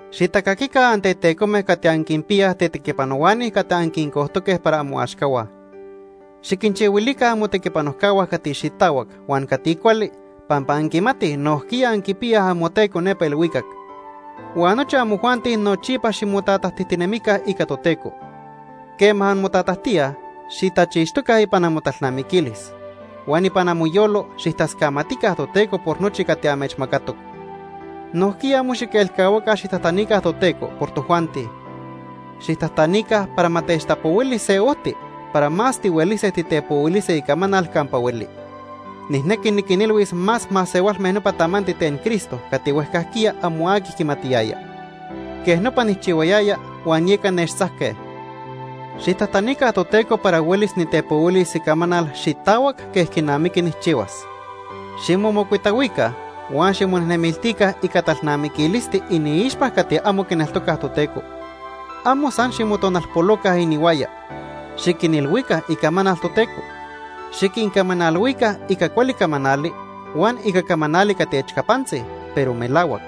Xitacaquica antetecome cati anquinpiyaj tetequipanohuani cati anquincojtoque para amoaxcahua. Xiquinchihuilica amotequipanojcahua cati xitahuac huan cati cuali pampa anquimatij nojquiya anquipiyaj amoTeco nepa ilhuicac. Huan nochi amojuanti nochipa ximotatajtijtinemica ica Toteco. Quema anmotatajtíaj, xitachixtoca ipan amotalnamiquilis. Huan ipan amoyolo xijtascamatica Toteco por nochi cati amechmacatoc. Nojquiya amo xiquelcahuaca xijtajtanica Toteco por tojuanti. Xijtajtanica para ma techtapohuili se ojti para más tihuelise titepohuilise icamanal campa hueli. Nijnequi niquinilhuis más masehualme nopa tamanti ten Cristo cati huejcajquiya amo aqui quimatiyaya. Quej nopa nijchihuayaya huan yeca nechtzajque. Xijtajtanica Toteco para huelis nitepohuilis icamanal xitahuac quej quinamiqui nijchihuas. Ximomocuitahuica huan ximonejnemiltica ica talnamiquilisti iniixpa cati amo quineltocaj Toteco. Amo san ximotonalpoloca inihuaya. Xiquinilhuica icamanal Toteco. Xiquincamanalhuica ica cuali camanali huan ica camanali cati echcapantzi, pero melahuac.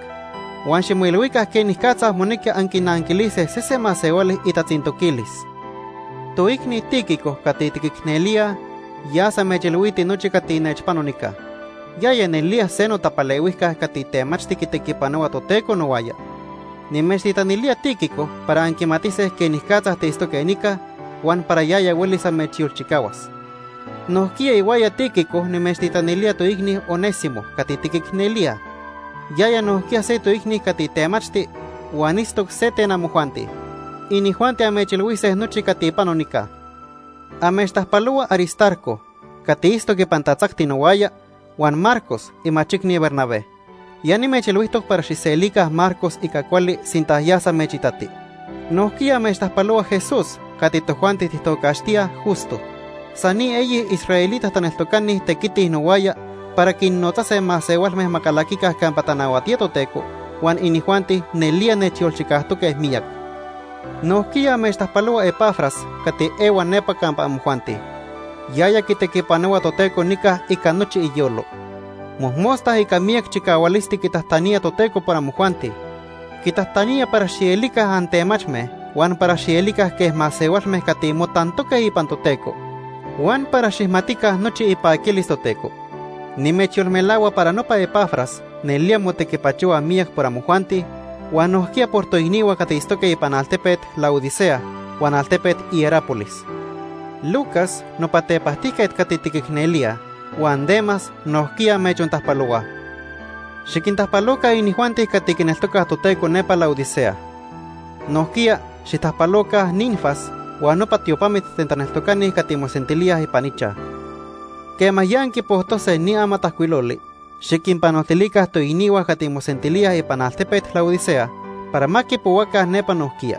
Huan ximoilhuica quenicatza monequi anquinanquilise sese masehuali itatzintoquilis. Toicni Tíquico cati tiquicnelíaj yas amechilhuiti nochi cati nechpano nica. Yaya nelía se notapalehuijca cati temachti quitequipanohua Toteco nohuaya. Nimechtitanilía Tíquico para anquimatise quenicatza tiitztoque nica huan para yaya huelis amechyolchicahuas. Nojquiya ihuaya Tíquico nimechtitanilía toicni Onésimo cati tiquicnelíaj. Yaya nojquiya se toicni cati temachti huan itztoc se ten amojuanti. Inijuanti amechilhuise nochi cati pano nica. Amechtajpalohua Aristarco cati itztoc ipan tatzacti nohuaya huan Marcos imachicni Bernabé. Ya nimechilhuijtoc para xijselica Marcos ica cuali sinta yas amechitati. Nojquiya amechtajpalohua Jesús cati tojuanti tijtocaxtíaj Justo. San ni eyi israelita taneltocani tequitij nohuaya para quinnotzase masehualme ma calaquica campa tanahuatía Toteco, huan inijuanti nelía nechyolchicajtoque miyac. Nojquiya amechtajpalohua Epafras cati ehua nepa campa amojuanti. Yaya quitequipanohua Toteco nica ica nochi iyolo. Mojmosta ica miyac chicahualisti quitajtanía Toteco por amojuanti. Quitajtanía para xielica antemachme, huan para xielica quej masehualme cati motantoque ipan Toteco huan para ma xijmatica nochi ipaquilis Toteco. Nimechyolmelahua para nopa Epafras nelía motequipachohua miyac por amojuanti huan nojquiya por toicnihua cati itztoque ipan altepet Laodicea huan altepet Hierápolis. Lucas, nopa tepajtijquet cati tiquicnelíaj, huan Demas nojquiya amechontajpalohuaj. Xiquintajpaloca inijuanti cati quineltocaj Toteco nepa Laodicea. Nojquiya xijtajpaloca Ninfas huan nopa tiopamit ten taneltocani cati mosentilíaj ipan ichaj. Quema ya anquipojtose ni amatajcuiloli, xiquinpanoltilica toicnihua cati mosentilíaj ipan altepet Laodicea para ma quipohuaca nepa nojquiya.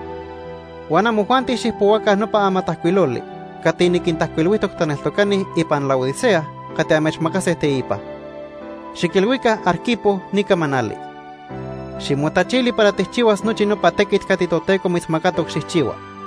Huan amojuanti xijpohuaca nopa amatajcuiloli cati niquintajcuilhuijtoc taneltocani ipan Laodicea cati amechmacase teipa. Xiquilhuica Arquipo ni camanali: “Ximotachili para tijchihuas nochi nopa tequit cati Toteco mitzmacatoc xijchihua.”